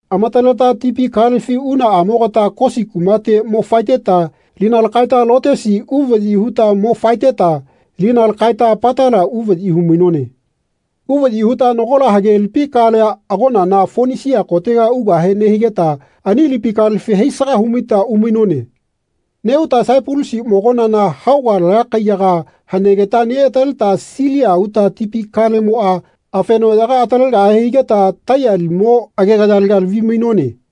Amataleta tipi kalefi unaꞌamogata Kosi kumate mo faeteta lina takaeta Lotesi uvaꞌyi huta mo faeteta lina lakaeta Patala uvaꞌyi humainone. Uvaꞌyi huta nagola hagelipi kalea agonana Fonisia kotega ugahe nehigeta ani lipi kalefi haisaga humaita umainone. Neꞌuta Saipalusi mogonana haoga laya kaiyaga hanegeta neꞌataleta Silia uta tipi kalemoꞌa afenoꞌyaga atalegahe higeta Taiya limo agegayalega lavi-mainone.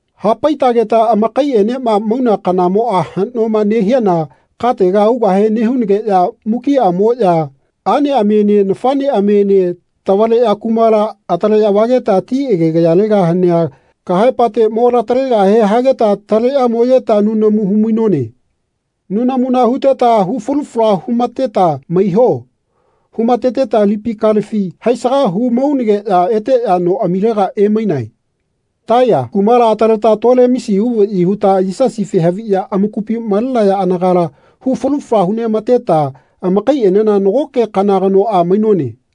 Hapaitageta amakaiꞌenema mauna kanamoꞌa haꞌnoma nehiana katega ugahe nehunageꞌya mukiꞌamoꞌya aꞌneꞌamiene nafaꞌneꞌamiene tavaleꞌya kumala ataleꞌya vageta ti agegayalega hanea kahaepate mo latalegahe hageta taleꞌya moyeta nunamu humainone. Nunamuna huteta hufalu fala humateta “Maiho.” humateteta tipi kalefi haisaga humaunageꞌya eteꞌya noꞌamilega emainae. Taili kumala ataleta Tolemesi uvaꞌyi huta Yisasife haviꞌya amakupi malenaya anagala hu falu fala huneꞌamateta amakaiꞌenena nagoke kana kanoꞌa mainone.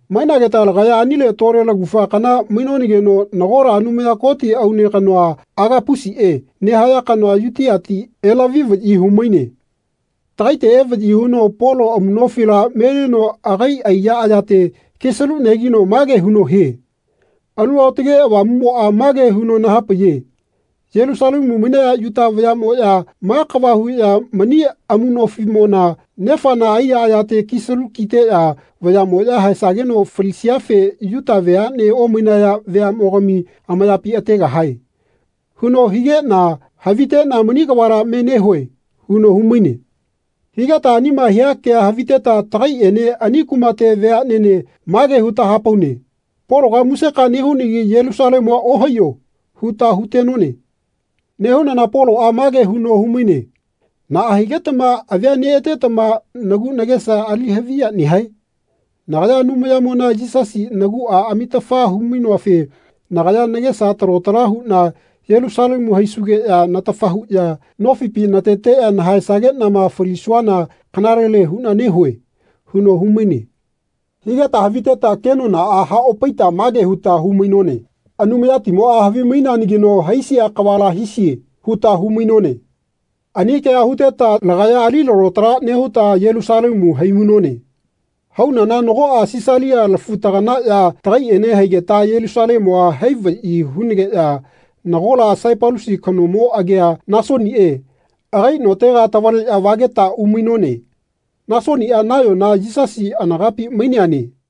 Mainageta lagaya anile tole lagufa kana mainonageno nagola Anumaya Koti aune kanoa Agapusiꞌe nehaya kanoa Yutiati elavi-vaꞌyi humaine. Takaite evaꞌyi huno Polo amuꞌnofila melino agaiꞌa aiya ayate kisalu negino mage huno hie “Alu Aotage Avamuꞌmoꞌa mage huno nahapaiye ‘Yelusalemu mainaya Yuta vayaꞌmoꞌya ma kava huꞌya mani amuꞌnofiꞌmona nefana aiya ayate kisalu kiteꞌya vayaꞌmoꞌya haesageno falisiafe Yuta veaꞌne omainaya vayaꞌmogami amayapi ategahae.’ huno hikeꞌna haviteꞌna mani kavala me nehue.” huno humaine. Higeta anima hia kea haviteta tagaiꞌene ani kumate veaꞌnene mage huta hapaune “Pologa museka nehunagi Yelusalemua ohaiyo.” huta hutenone. Nehunana Poloꞌa mage huno humaine “Naꞌa higetama avia neꞌatetama nagu nagesa ali haviya nehae? Nagaya Anumayanimona Yisasi naguꞌa amitafa humainoafe nagaya nagesa talo tala huꞌna Yelusalemu haisugeꞌya natafa huꞌya nofipi nateteꞌya nahaesageꞌnama falisuana kanalele huꞌna nehue.” huno humaine. Higeta haviteta kenonaꞌa haꞌopaita mage huta humainone “Anumayatimoꞌa havimaineanagino haisia kavala hisie.” huta humainone. Ani kea huteta lagaya ali lalo tala nehuta Yelusalemu haimainone. Haunana nagoꞌa Sisalia lafu-taganaꞌya tagaiꞌene haigeta Yelusalemua hai vaꞌyi hunageꞌya nagola Saipalusi kanomo agia Nasoniꞌe agai notega tavaleꞌya vageta umainone. Nasoniꞌa nayona Yisasi anagapi maineane.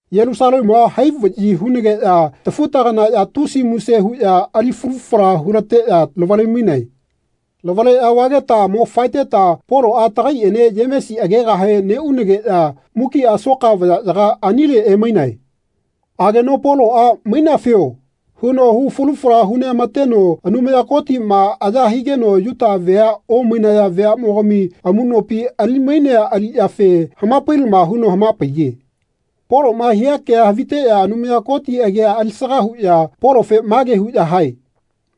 Yelusalemua hai vaꞌyi hunageꞌya tafu-taganaꞌya tusi muse huꞌya ali falu fala hulateꞌya lavale-mainae. Lavaleꞌya vageta mo faeteta Poloꞌa tagaiꞌene Yemesi agegahe neꞌunageꞌya mukiꞌa soka vayaꞌyaga anile emainae. Ageno Poloꞌa “Mainafio.” huno hu falu fala huneꞌamateno Anumaya Kotiꞌma aya higeno Yuta vea omainaya veaꞌmogami amuꞌnopi ali-mainea aliꞌyafe hamapailama huno hamapaiye. Poloꞌma hia kea haviteꞌya Anumaya Koti agia alisaga huꞌya Polofe mage huꞌya hae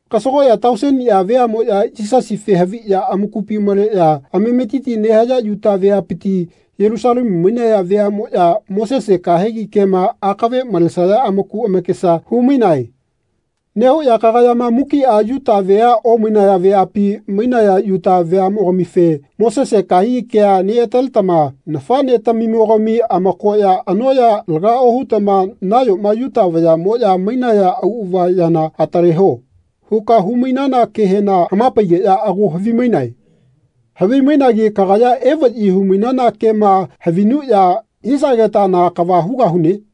“Kasagoꞌya tauseniꞌa veaꞌmoꞌya Yisasife haviꞌya amakupi maleꞌya amametiti nehaya Yuta veapiti Yelusalemu mainaya veaꞌmoꞌya Mosese kahegi kema akave malesaya amaku amakesa humainae. Nehuꞌya kagayama mukiꞌa Yuta vea omainaya veapi mainaya Yuta vayaꞌmogamife ‘Mosese kahegi kea neꞌataletama nafaꞌnetamimogami amakoya anoꞌya laga ohutama nayoma Yuta vayaꞌmoꞌya mainaya auꞌava yana atale ho.’ huka humainana kehena hamapaigeꞌya ago havimainae. Havimainagi kagayama evaꞌyi humainana kema havinuꞌya hisageta na kava hugahune?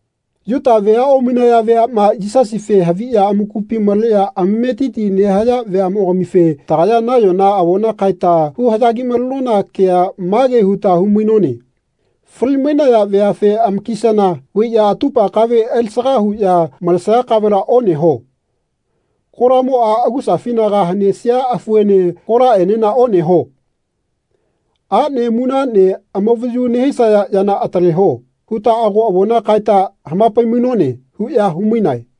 Yuta vea omainaya veaꞌma Yisasife haviꞌya amakupi maleꞌya amametiti nehaya veaꞌmogamife tagaya nayona avona kaeta huhaꞌya gi-malenona kea mage huta humainone ‘Fali-mainaya veafe amakisana vaiꞌya atupa kave alisaga huꞌya malesaya kavela oneho. Kolamoꞌa agusafinaga hanesia afuene kolaꞌenena oneho. Aꞌne munaꞌne amavayu nehisaya yana ataleho.’ huta ago avona kaeta hamapai-mainone.” huꞌya humainae.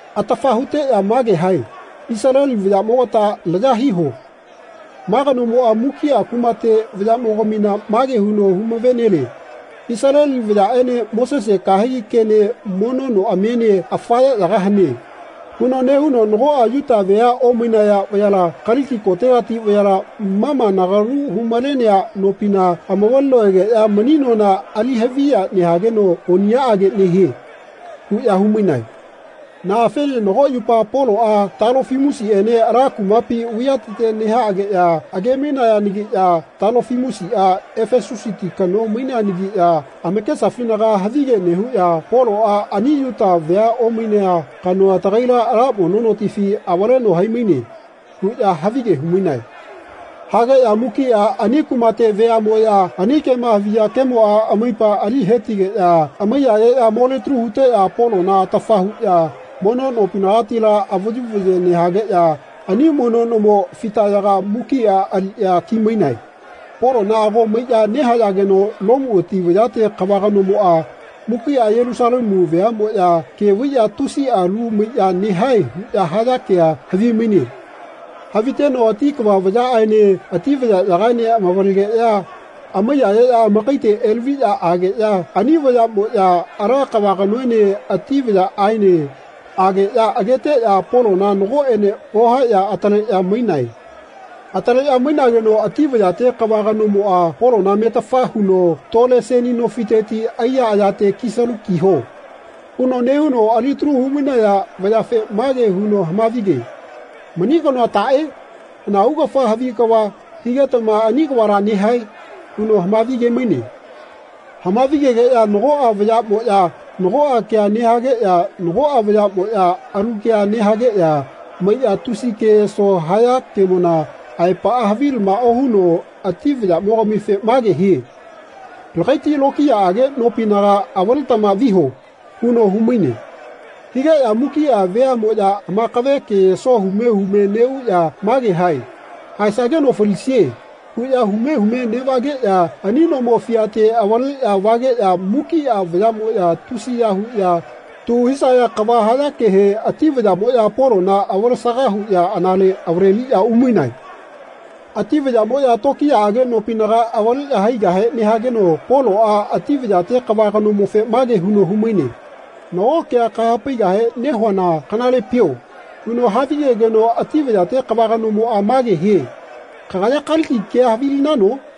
Atafa huteꞌya mage hae “Isaleli vayaꞌmogata laya hiho. Ma kanomoꞌa mukiꞌa kumate vayaꞌmogamina mage huno humave-nelie ‘Isaleli vayaꞌene Mosese kahegi kene mono noꞌamiene afa yaꞌyaga hane.’ huno nehuno nagoꞌa Yuta vea omainaya vayala Kaliki kotegati vayala ma ma nagalu humalenea nopina amavaleno egeꞌya mani nona ali haviya nehageno oniꞌyaꞌage nehie.” huꞌya humainae. Naꞌafene nago yupa Poloꞌa Talofimusiꞌene ala kumapi vaiyateti nehaꞌageꞌya age-mainayanagiꞌya Talofimusiꞌa Efesusiti kano maineanagiꞌya amakesafinaga havige nehuꞌya “Poloꞌa ani Yuta vea omainea kanoa tagaila ala mono notifi avaleno haimaine.” huꞌya havige humainae. Hageꞌya mukiꞌa ani kumate veaꞌmoꞌya ani kema haviya kemoꞌa amaipa ali hetigeꞌya amaiyayeꞌya molitalu huteꞌya Polona atafa huꞌya mono nopinagatila avayu vaye nehageꞌya ani mono nomo fitayaga mukiꞌa aliꞌya kimainae. Polona ago maiꞌya nehayageno Lomu ati vayate kava kanomoꞌa mukiꞌa Yelusalemu veaꞌmoya ke vaiꞌya tusiꞌa lu maiꞌya nehae huꞌya haya kea havimaine. Haviteno ati kava vayaꞌaene ati vayaꞌyagaene amavalegeꞌya amaiyayeꞌya amakaite elaviꞌya ageꞌya ani vayaꞌmoꞌya ala kava kanoene ati vayaꞌaene ageꞌya ageteꞌya Polona nagoꞌene ohaeꞌya ataleꞌya mainae. Ataleꞌya mainageno ati vayate kava kanomoꞌa Polona metafa huno “Tole seni nofiteti aiya ayate kisalu kiho.” huno nehuno alitalu humainaya vayafe mage huno hamavige “Mani kanoa taꞌe? Hana augafa havi kava higetama ani kavala nehae?” huno hamavige-maine. Hamavigegeꞌya nagoꞌa vayaꞌmoꞌya nagoꞌa kea nehageꞌya nagoꞌa vayaꞌmoꞌya alu kea nehageꞌya maiꞌya tusiꞌa keyeso haya kemona aepaꞌa havilama ohuno ati vayaꞌmogamife mage hie “Lagaiti lokiyaꞌage nopinaga avaletama viho.” huno humaine. Higeꞌya mukiꞌa veaꞌmoꞌya amakave keyeso hume hume neꞌuꞌya mage hae “Haesageno falisie.” huꞌya hume hume neꞌvageꞌya ani nomo fiate avaleꞌya vageꞌya mukiꞌa vayaꞌmoꞌya tusiya huꞌya tu hisaya kava hayakehe ati vayaꞌmoꞌya Polona avalesaga huꞌya anale avaleliꞌya umainae. Ati vayaꞌmoꞌya tokiyaꞌage nopinaga avaleꞌya haigahe nehageno Poloꞌa ati vayate kava kanomofe mage huno humaine “Nago kea kahapaigahe nehuana kanalepio?” huno havigegeno ati vayate kava kanomoꞌa mage hie “Kagaya Kaliki kea havilinano?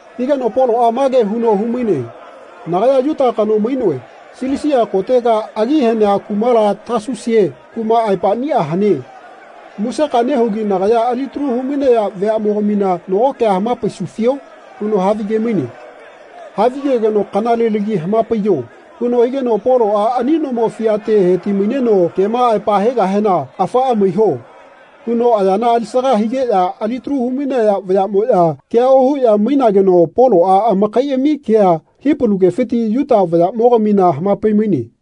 Higeno Poloꞌa mage huno humaine “Nagaya Yuta kano mainoe. Silisia kotega agi hanea kumala Tasusie kuma aepaꞌnia hane. Museka nehugi nagaya alitalu humainaya veaꞌmogamina nago kea hamapaisufio?” huno havige-maine. Havigegeno “Kanalelagi hamapaiyo.” huno higeno Poloꞌa ani nomo fiate heti-maineno kema aepa hegahena “Afaꞌa maiho.” huno ayana alisaga higeꞌya alitalu humainaya vayaꞌmoꞌya kea ohuꞌya mainageno Poloꞌa amakaiꞌami kea Hipalu kefiti Yuta vayaꞌmogamina hamapai-maine.